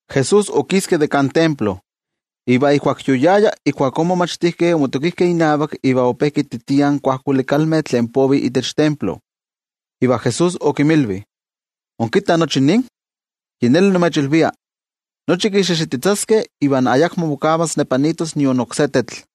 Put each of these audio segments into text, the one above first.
Jesús okiski de kan templo, iva ijkuak yoyaya, ijkuakó in momachtijkeh omotokijkeh inavak iva ope kititiah in kuajkuali kalmeh tlen povih itech templo. Iva Jesús okinmilvi: —¿Inkittah nochi nin? Yi neli nimechilvia, nochi kixixititzaskeh iva ayakmo mokavas nepanitos nion oksé tetl.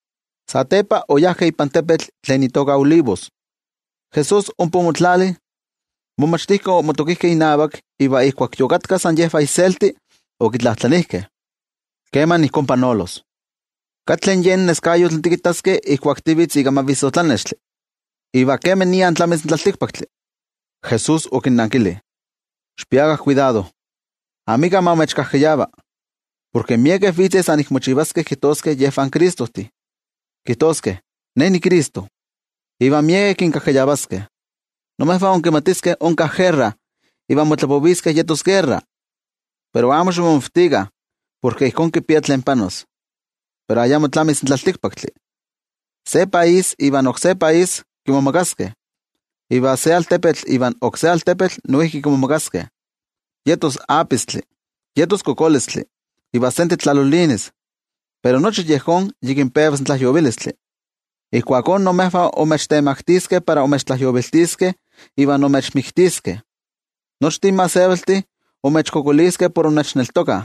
Satepa oyajkeh ipan tepetl tlen itoka Olivos. Jesús ompa omotlali, in momachtijkeh omotokijkeh inavak, iva ijkuak yokatkah san yejvah inselti, okitlajtlanijkeh: —¿Keman ijkó panolos? ¿Katle neskayotl tikittaskeh ijkuak tivitz ika mavissotlanextli? ¿Iva kemania tlamis in tlaltikpaktli? Jesús okinnankili: —¡Xikpiakah kuidado! Amika ma imechkajkayava. Porke miekeh vitzeh san kinejnekiskeh notoka, kijtoskeh: “Ne niCristo”, iva miekeh kinkajkayavaskeh. Imejvah inkimatiskeh onka guerra iva motlapoviskeh yetos guerra, pero amo ximomavtikah, porke ijkó kipia tlen panolos. Pero ayamo tlamis in tlaltikpaktli. Se país kimomagas ivan oksé país, iva se altepetl kimomagas ivan oksé altepetl. Yetos apistli, yetos kokolistli, iva sentetl tlalolinis. Pero nochi yejón yikin pevas in tlajyovilistli. ’Ijkuakó imejvah imechtemaktiskeh para imechtlajyoviltiskeh iva imechmiktiskeh. Nochtin gentejtih imechkualankaitaskeh por innechneltokah.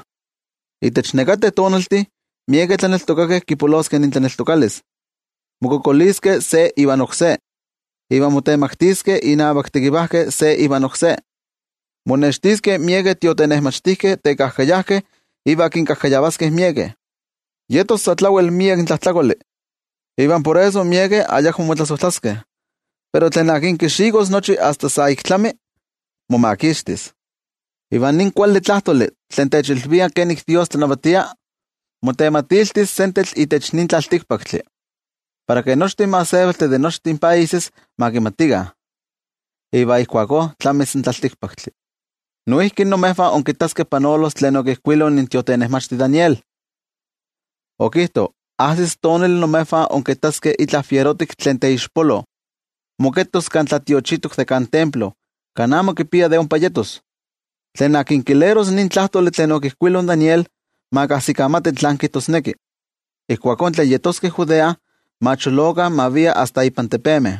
Itech nekateh tonaltih miekeh tlaneltokakeh kipoloskeh intlaneltokalis, mokualankaitaskeh se iva oksé, iva motemaktiskeh inavak tekivajkeh se iva oksé. Monextiskeh miekeh tiotenejmachtijkeh tekajkayajkeh iva kinkajkayavaskeh miekeh. Yetos sa tlawel miek tlajtlakoli, iva por eso miekeh ayakmo motlasojtlaskeh. Pero tlen akin kixikos nochi asta sa ik tlami, momakixtis. Iva nin kuali tlajtoli tlen techilvia kenik in Dios tlanavatia, motematiltis sentetl itech nin tlaltikpaktli, para ke nochtin gentejtih de nochtin países ma kimatikah. Iva ijkuakó tlamis in tlaltikpaktli. ’Noijki imejvah inkittaskeh panolos tlen okijkuilo in tiotenejmachti Daniel, okijto ajsis tonali imejvah inkittaskeh itla fierotik tlen teixpolo, moketos Kan Tlatiochitok de kan templo kan amo kipia de ompa yetos, —tlen kileros nin tlajtoli tlen okijkuilo Daniel, ma kajsikamati tlán kijtosneki—, ijkuakó tlen yeskeh Judea, ma cholokah ma viah asta ipan tepemeh.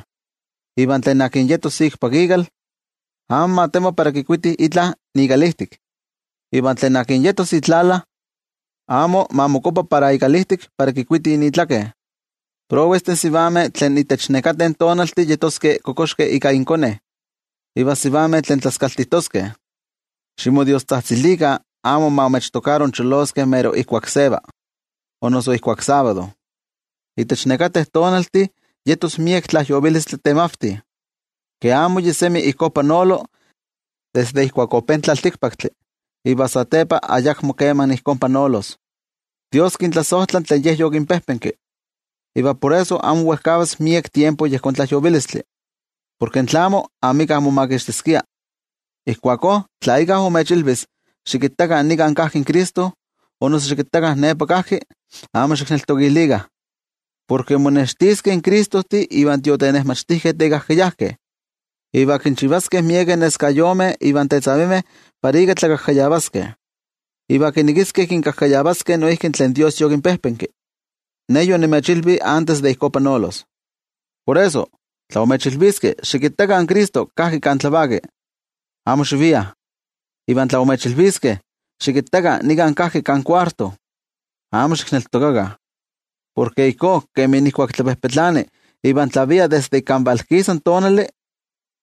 Iva tlen yetos ikpak ikal, amo ma temo para kikuiti itla ikalijtik. Iva tlen yetos itlala, amo ma mokuapa para ikalijtik para kikuiti itlaken. ¡Prowestih sivameh tlen itech nekateh tonaltih kipixtoskeh inkonetzi inmijtik iva in sivameh tlen tlaskaltijtoskeh! Ximodiostzajtzilikah amo ma imechtokaro incholoskeh mero ijkuak seva, o noso ijkuak sábado. Itech nekateh tonaltih yetos miek tlajyovilistli temavti, ke amo yi semi ijkó panolo desde ijkuak ope in tlaltikpaktli iva satepa ayakmo kema ijkó panolos. Dios kintlasojtla tlen Ye yokinpejpenki, iva por eso amo wejkavas miek tiempo yejón tlajyovilistli. Porke tlamo, amika omomakixtiskia. ’Ijkuakó tla íkka imechilvis: “Xikittakah, nika kajki in Cristo”, o noso “Xikittakah, nepa kajki”, amo xikneltokilikah. Porke monextiskeh Cristojtih iva tiotenejmachtijkeh tekajkayajkeh, iva kinchivaskeh miekeh neskayomeh iva nexkuitiltih para ika tlakajkayavaskeh. Iva kinekiskeh kinkajkayavaskeh noijki tlen Dios yokinpejpenki. Ne yonimechilvi antes de ijkó panolos. Por eso, tla imechilviskeh: “Xikittakah, in Cristo kajki kan tlavaki”, amo xiviah. Iva tla imechilviskeh: “Xikittakah, nika kajki kan kuarto”, amo xikneltokakah. Porke ijkó kemi ijkuak tlapejpetlani iva tlavia desde ik kan valkisa in tonali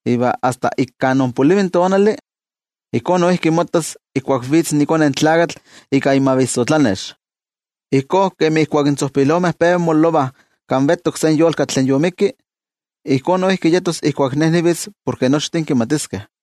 iva asta ik kan onpolivi in tonali, ijkó noijki mottas ijkuak vitz iKone in Tlakatl ika imavissotlanex. Ijkó kemi ijkuak in tzojpilomeh peva mololovah kan vetok se yolkatl tlen yomikki, ijkó noijki yetos ijkuak Ne nivitz porke nochtin kimatiskeh.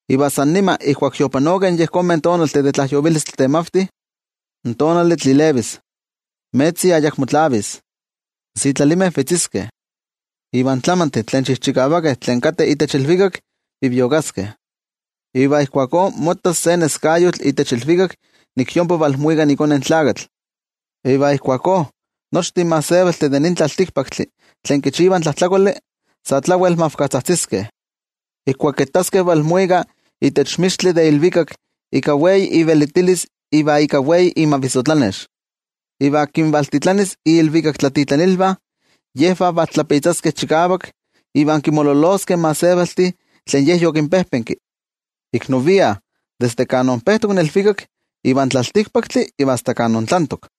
’Iva san nima ijkuak yopanokeh in yejonmeh tonaltih de tlajyovilistli temavti, in tonali tlilevis, in metzi ayakmo tlavis, in sitlalimeh vetziskeh iva in tlamantih tlen chijchikavakeh tlen kateh itech ilvikak viviokaskeh. Iva ijkuakó mottas se neskayotl itech ilvikak nik yompa valmuika iKone in Tlakatl, iva ijkuakó nochtin gentejtih de nin tlaltikpaktli tlen kichivah tlajtlakoli sa tlawel mavkatzajtziskeh ijkuak kittaskeh valmuika itech mixtli de ilvikak, ika miek ivelitilis iva ika wei imavissotlanex. Iva kinvaltitlanis iilvikaktlatitlanilvah, yejvah valtlapitzaskeh chikavak, iva kinmololoskeh in gentejtih tlen Ye yokinpejpenki, ik novian itech nin tlaltikpaktli desde kan onpejtok iva asta kan ontlantok.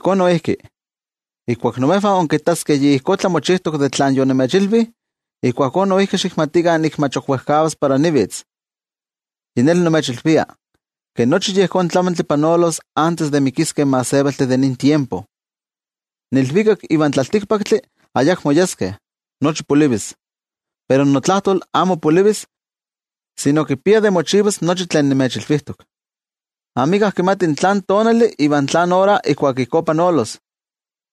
Ijkó noijki, ijkuak imejvah inkittaskeh yi ijkó tlamochijtok de tlan yonimechilvi, ijkuakó noijki xikmatikah nik mach ok wejkavas para vitz iKone in Tlakatl. Yi neli nimechilvia, ke nochi yejón tlamantli panolos antes de ixpoliviskeh in gentejtih de nin tiempo. In ilvikak ivan tlaltikpaktli ayakmo yeskeh, nochi polivis, pero notlajtol amo polivis, sino kipia de mochivas nochi tlen nimechilvijtok. ’Amika kimati tlán tonali iva tlán ora ijkuak ijkó panolos,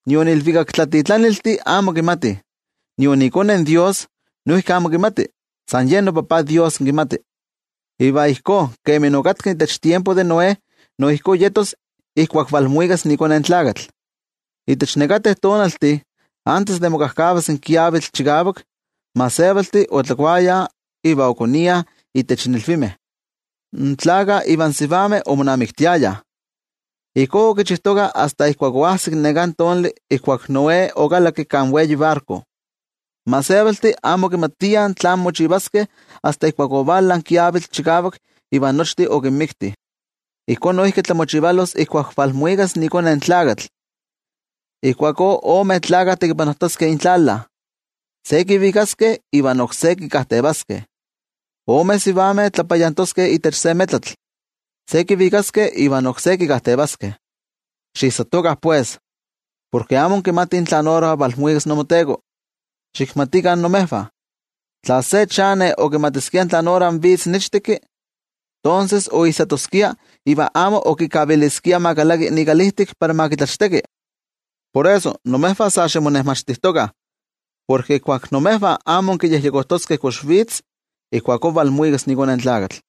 nion ilvikaktlatitlaniltih amo kimatih, nion iKone in Dios noijki amo nikmati, sino san yen noTajtzi Dios kimati. ’Iva ijkó kemi okatka itech tiempo de Noé, no ijkó yetos ijkuak valmuikas iKone in Tlakatl. Itech nekateh tonaltih, antes de mokajkavas in kiavitl chikavak, in gentejtih otlakuayah iva okoniah itech ilvimeh, in tlakah ivan sivameh omonamiktiayah. Ijkó okichijtokah asta ijkuak oajsik neká tonali ijkuak Noé okalakki kan wei barko. In gentejtih amo okimatiah tlán mochivaskeh asta ijkuak ovala in kiavitl chikavak iva nochtin okinmikti. Ijkó noijki tlamochivalos ijkuak valmuikas iKone in Tlakatl. Ijkuakó, ome tlakah tekipanojtoskeh intlala. Se kivikaskeh ivan oksé kikajtevaskeh. Ome sivameh tlapayantoskeh itech se metlatl. Se kivikaskeh ivan oksé kikajtevaskeh. ’Xiijsatokah pues, porke amo inkimatih tlan ora valmuikas imoTeko. Xikmatikah imejvah, tla se chane okimatiskia tlan ora vitz in ichtekki, tonses oijsatoskia iva amo okikaviliskia ma kalaki ikalijtik para ma kitlachteki. Por eso, imejvah sa ximonejmachtijtokah, porke ijkuak imejvah amo inkiyejyekojtoskeh kox vitz, ijkuakó valmuikas iKone in Tlakatl.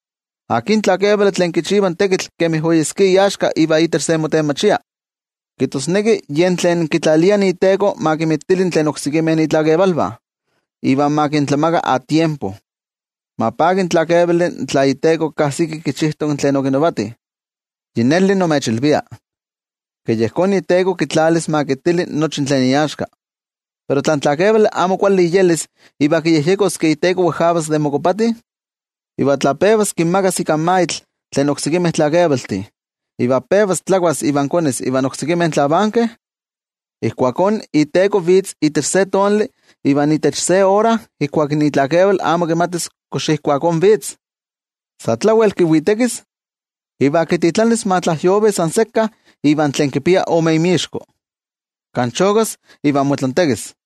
’¿Akin tlakevali tlen kichiva in tekitl kemi oyeskia iaxka iva itech se motenmachia? Kijtosneki yen tlen kitlalia iteko ma kinmitili tlen oksekimeh itlakevalvah, iva ma kintlamakah a tiempo. Ma paki in tlakevali tla iteko kajsiki kichijtok tlen okinavati. Yi neli nimechilvia, ke yejón iteko kitlalis ma kitili nochi tlen iaxka. Pero tla in tlakevali amo kuali iyelis iva kiyejyekos ke iteko wejkavas de mokopati, iva tla pevas kinmagas ika maitl tlen oksekimeh tlakevaltih, iva pevas tlakuas iva konis ivan oksekimeh tlavankeh, ijkuakó iteko vitz itech se tonali iva itech se ora ijkuak itlakeval amo kimatis kox ijkuakó vitz. Sa tlawel kiwitekis, iva kititlanis ma tlajyovi san sekka invan tlen kipiah ome inmixko kan chokas iva motlantekis.